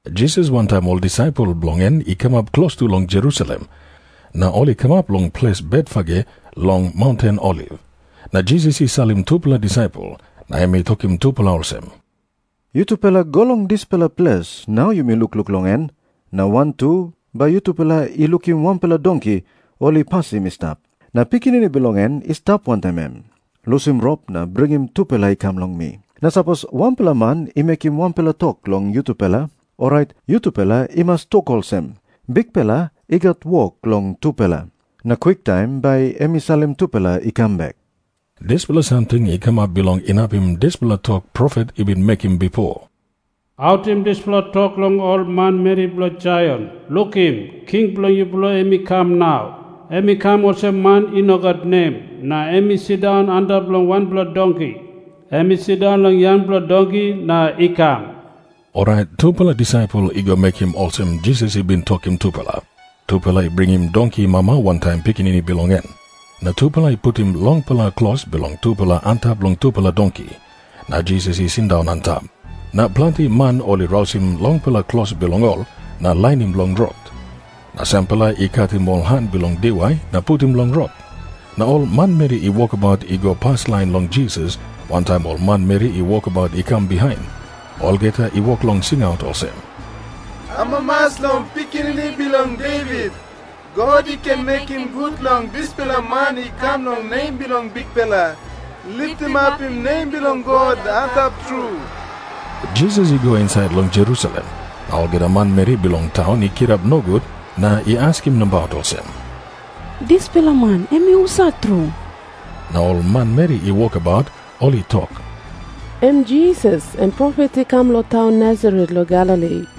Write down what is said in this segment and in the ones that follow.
Jisas wantaim ol disaipel bilong en i kamap klostu long Jerusalem, na ol i kamap long ples Betfage long maunten Oliv. Na Jisas i salim tupela disaipel na em i tokim tupela olsem, “Yutupela go long dispela ples nau yumi lukluk long en. Na wantu bai yutupela i lukim wanpela donki ol i pasim i stap, na pikinini bilong en i stap wantaim em. Lusim rop na bringim tupela i kam long mi. Na sapos wanpela man i mekim wanpela tok long yutupela, orait yutupela i mas tok olsem, ‘Bikpela i gat wok long tupela.’ Na kwiktaim bai em i salim tupela i kam.” Dispela samting i kamap bilong inapim dispela tok profet i bin mekim bipo, “Autim dispela tok long ol manmeri bilong Saion, ‘Lukim. King bilong yupela em i kam nau. Em i kam olsem man i no gat nem, na em i sindaun antap long wanpela donki. Em i sindaun long yangpela donki na i kam.’” Orait tupela disaipel i go mekim olsem Jisas i bin tokim tupela. Tupela i bringim donki mama wantaim pikinini bilong en, na tupela i putim longpela klos bilong tupela antap long tupela donki. Na Jisas i sindaun antap. Na planti man ol i rausim longpela klos bilong ol na lainim long rot. Na sampela i katim ol han bilong diwai na putim long rot. Na ol manmeri i wokabaut i go paslain long Jisas wantaim ol manmeri i wokabaut i kam bihain, olgeta i wok long singaut olsem, “Amamas long Pikinini Bilong Devit. God i ken mekim gut long dispela man i kam long nem bilong Bikpela. Litimapim nem bilong God Antap Tru.” Jisas i go insait long Jerusalem, na olgeta manmeri bilong taun i kirap nogut na i askim nabaut olsem, “Dispela man em i husat tru?” Na ol manmeri i wokabaut ol i tok, “Em Jisas, em profet i kam long taun Nasaret long Galili.”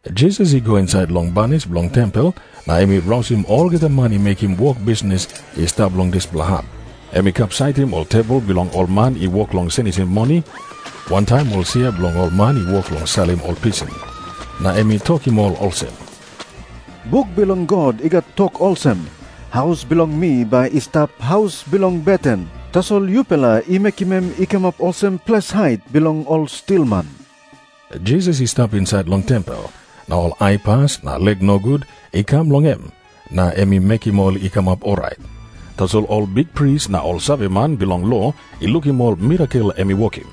Jisas i go insait long banis bilong tempel na em i rausim olgeta man i mekim wok bisnis i stap long dispela hap. Em i kapsaitim ol tebol bilong ol man i wok long senisim mani, wantaim ol sia bilong ol man i wok long salim ol pisin. Na em i tokim ol olsem, “Buk bilong God i gat tok olsem, ‘Haus bilong mi bai i stap haus bilong beten.’ Tasol yupela i mekim em i kamap olsem ples hait bilong ol stilman.” Jisas i stap insait long tempel, na ol aipas na lek nogut i kam long em, na em i mekim ol i kamap orait. Tasol ol bikpris na ol saveman bilong lo i lukim ol mirakel em i wokim,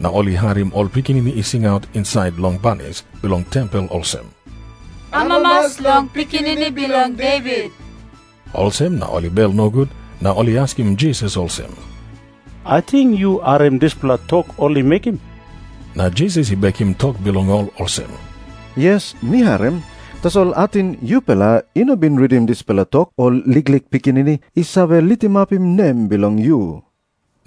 na ol i harim ol pikinini i singaut insait long banis bilong tempel olsem, “Amamas long Pikinini Bilong Devit.” Olsem na ol i bel nogut na ol i askim Jisas olsem, “Ating yu harim dispela tok ol i mekim?” Na Jisas i bekim tok bilong ol olsem, “Yes, mi harim. Tasol ating yupela i no bin ritim dispela tok, ‘Ol liklik pikinini i save litimapim nem bilong yu.’”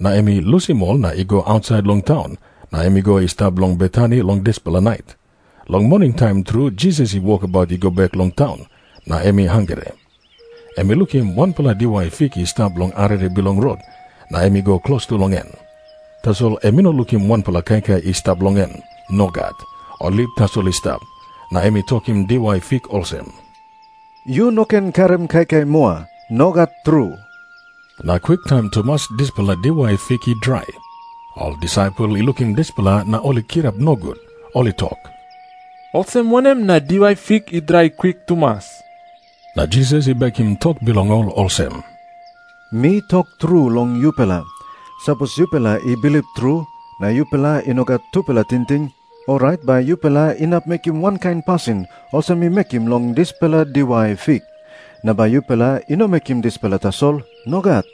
Na em i lusim ol na i go ausait long taun, na em i go i stap long Betani long dispela nait. Long moningtaim tru Jisas i wokabaut i go bek long taun, na em i hangre. Em i lukim wanpela diwai fik i stap long arere bilong rot, na em i go klostu long en. Tasol em i no lukim wanpela kaikai i stap long en. Nogat. Ol lip tasol i stap. Na em i tokim diwai fik olsem, “Yu no ken karim kaikai moa. Nogat tru.” Na kwiktaim tumas dispela diwai fik i drai. Ol disaipel i lukim dispela, na ol i kirap nogut. Ol i tok, “Olsem wanem na diwai fik i drai kwik tumas?” Na Jisas i bekim tok bilong ol olsem, “Mi tok tru long yupela, sapos yupela i bilip tru, na yupela i no gat tupela tingting, orait bai yupela inap mekim wankain pasin olsem mi mekim long dispela diwai fik. Na bai yupela i no mekim dispela tasol. Nogat.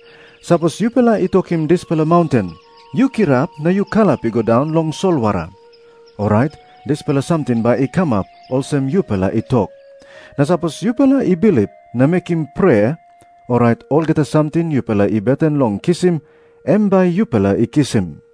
Sapos yupela i tokim dispela maunten, ‘Yu kirap na yu kalap i go daun long solwara,’ orait dispela samting bai i kamap olsem yupela i tok. Na sapos yupela i bilip na mekim prea, orait olgeta samting yupela i beten long kisim, em bai yupela i kisim.”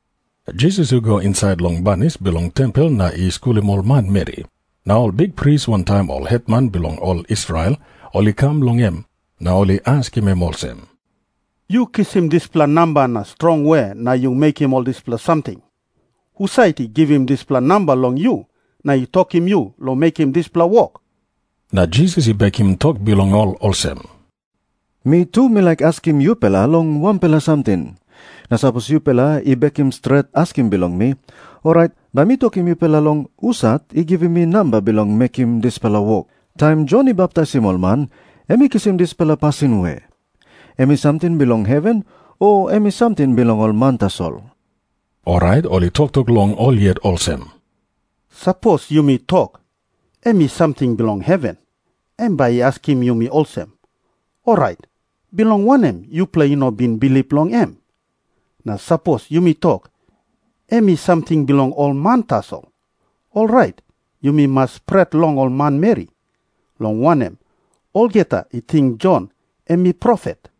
Jisas i go insait long banis bilong tempel na i skulim ol manmeri. Na ol bikpris wantaim ol hetman bilong ol Israel ol i kam long em na ol i askim em olsem, “Yu kisim dispela namba na strong we na yu mekim ol dispela samting? Husat i givim dispela namba long yu na i tokim yu long mekim dispela wok?” Na Jisas i bekim tok bilong ol olsem, “Mi tu mi laik askim yupela long wanpela samting. Na sapos yupela i bekim stret askim bilong mi, orait bai mi tokim yupela long husat i givim mi namba bilong mekim dispela wok. Taim Jon i baptaisim ol man, em i kisim dispela pasin we? Em i samting bilong heven, o em i samting bilong ol man tasol?” Orait ol i toktok long ol yet olsem, “Sapos yumi tok, ‘Em i samting bilong heven,’ em bai i askim yumi olsem, ‘Orait bilong wanem yupela i no bin bilip long em?’ Na sapos yumi tok, ‘Em i samting bilong ol man tasol,’ orait yumi mas pret long ol manmeri, long wanem, olgeta i ting Jon em i profet.”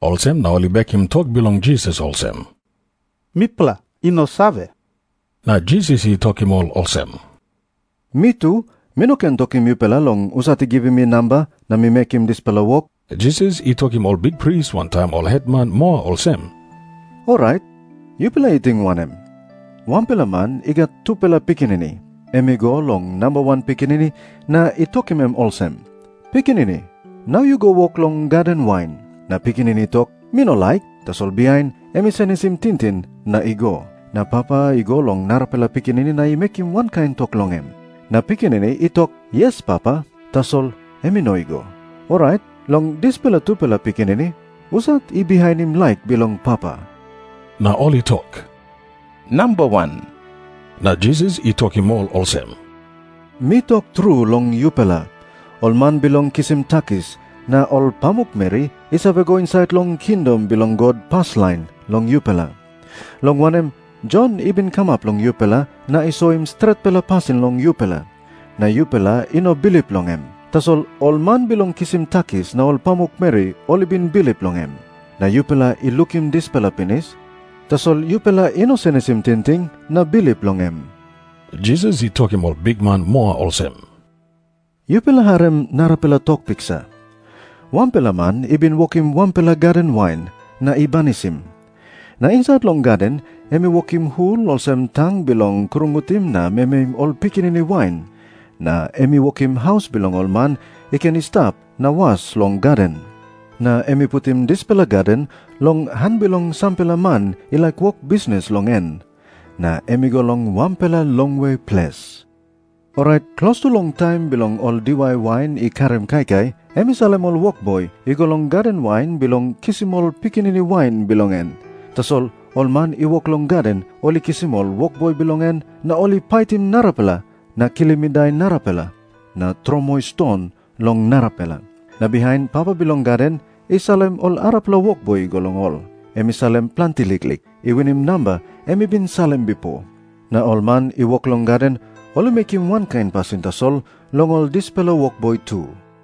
Olsem na ol i bekim tok bilong Jisas olsem, “Mipela i no save.” Na Jisas i tokim ol olsem, “Mi tu mi no ken tokim yupela long husat i givim mi namba na mi mekim dispela wok.” Jisas i tokim ol bikpris wantaim ol hetman moa olsem, “Orait yupela i ting wanem? Wanpela man i gat tupela pikinini. Em i go long namba wan pikinini na i tokim em olsem, ‘Pikinini, nau yu go wok long gaden wain.’ Na pikinini i tok, ‘Mi no laik.’ Tasol bihain em i senisim tingting na i go. Na papa i go long narapela pikinini na i mekim wankain tok long em. Na pikinini i tok, ‘Yes, papa.’ Tasol em i no i go. Orait long dispela tupela pikinini, husat i bihainim laik bilong papa?” Na ol i tok, “Namba wan.” Na Jisas i tokim ol olsem, “Mi tok tru long yupela, ol man bilong kisim takis na ol pamukmeri i save go insait long kingdom bilong God paslain long yupela. Long wanem, Jon i bin kamap long yupela na i soim stretpela pasin long yupela, na yupela i no bilip long em. Tasol ol man bilong kisim takis na ol pamukmeri ol i bin bilip long em. Na yupela i lukim dispela pinis, tasol yupela i no senisim tingting na bilip long em.” Jisas i tokim ol bikman moa olsem, “Yupela harim narapela tok piksa. Wanpela man i bin wokim wanpela gaden wain, na i banisim. Na insait long gaden em i wokim hul olsem tang bilong krungutim na memeim ol pikinini wain, na em i wokim haus bilong ol man i ken i stap na was long gaden. Na em i putim dispela gaden long han bilong sampela man i laik wok bisnis long en. Na em i go long wanpela longwe ples. Orait klostu long taim bilong ol diwai wain i karim kaikai, em i salim ol wokboi i go long gaden wain bilong kisim ol pikinini wain bilong en. Tasol ol man i wok long gaden ol i kisim ol wokboi bilong en, na ol i paitim narapela na kilim i dai narapela na tromoi ston long narapela. Na bihain papa bilong gaden i salim ol arapela wokboi i go long ol. Em i salim planti liklik, i winim namba em i bin salim bipo. Na ol man i wok long gaden ol i mekim wankain pasin tasol long ol dispela wokboi tu.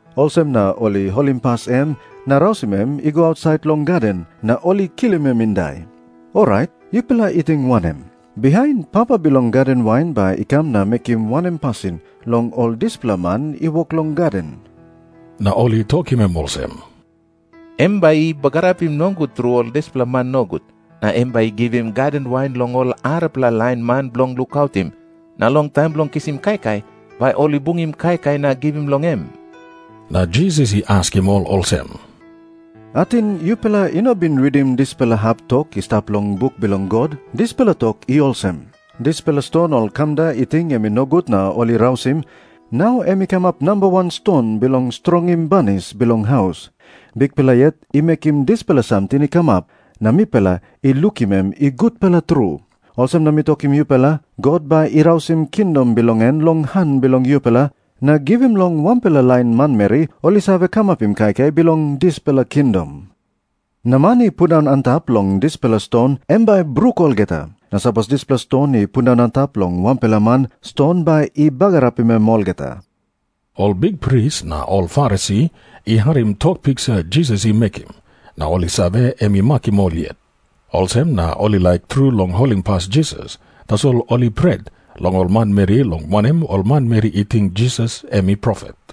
Olsem na ol i holimpas em na rausim em i go ausait long gaden, na ol i kilim em i dai. Orait yupela i ting wanem? Bihain papa bilong gaden wain bai i kam na mekim wanem pasin long ol dispela man i wok long gaden?” Na ol i tokim em olsem, “Em bai i bagarapim nogut tru ol dispela man nogut. Na em bai i givim gaden wain long ol arapela lain man bilong lukautim, na long taim bilong kisim kaikai bai ol i bungim kaikai na givim long em.” Na Jisas i askim ol olsem, “Ating yupela i no bin ritim dispela hap tok i stap long buk bilong God? Dispela tok i olsem, ‘Dispela ston ol kamda i ting em i nogut na ol i rausim, nau em i kamap nambawan ston bilong strongim banis bilong haus. Bikpela yet i mekim dispela samting i kamap, na mipela i lukim em i gutpela tru.’ Olsem na mi tokim yupela, God bai i rausim kingdom bilong en long han bilong yupela, na givim long wanpela lain manmeri ol i save kamapim kaikai bilong dispela kingdom. Na man i pundaun antap long dispela ston, em bai i bruk olgeta. Na sapos dispela ston i pundaun antap long wanpela man, ston bai i bagarapim em olgeta.” Ol bikpris na ol Farisi i harim tok piksa Jisas i mekim, na ol i save, em i makim ol yet. Olsem na ol i laik tru long holimpas Jisas, tasol ol i pret long ol manmeri, long wanem, ol manmeri i ting Jisas em i profet.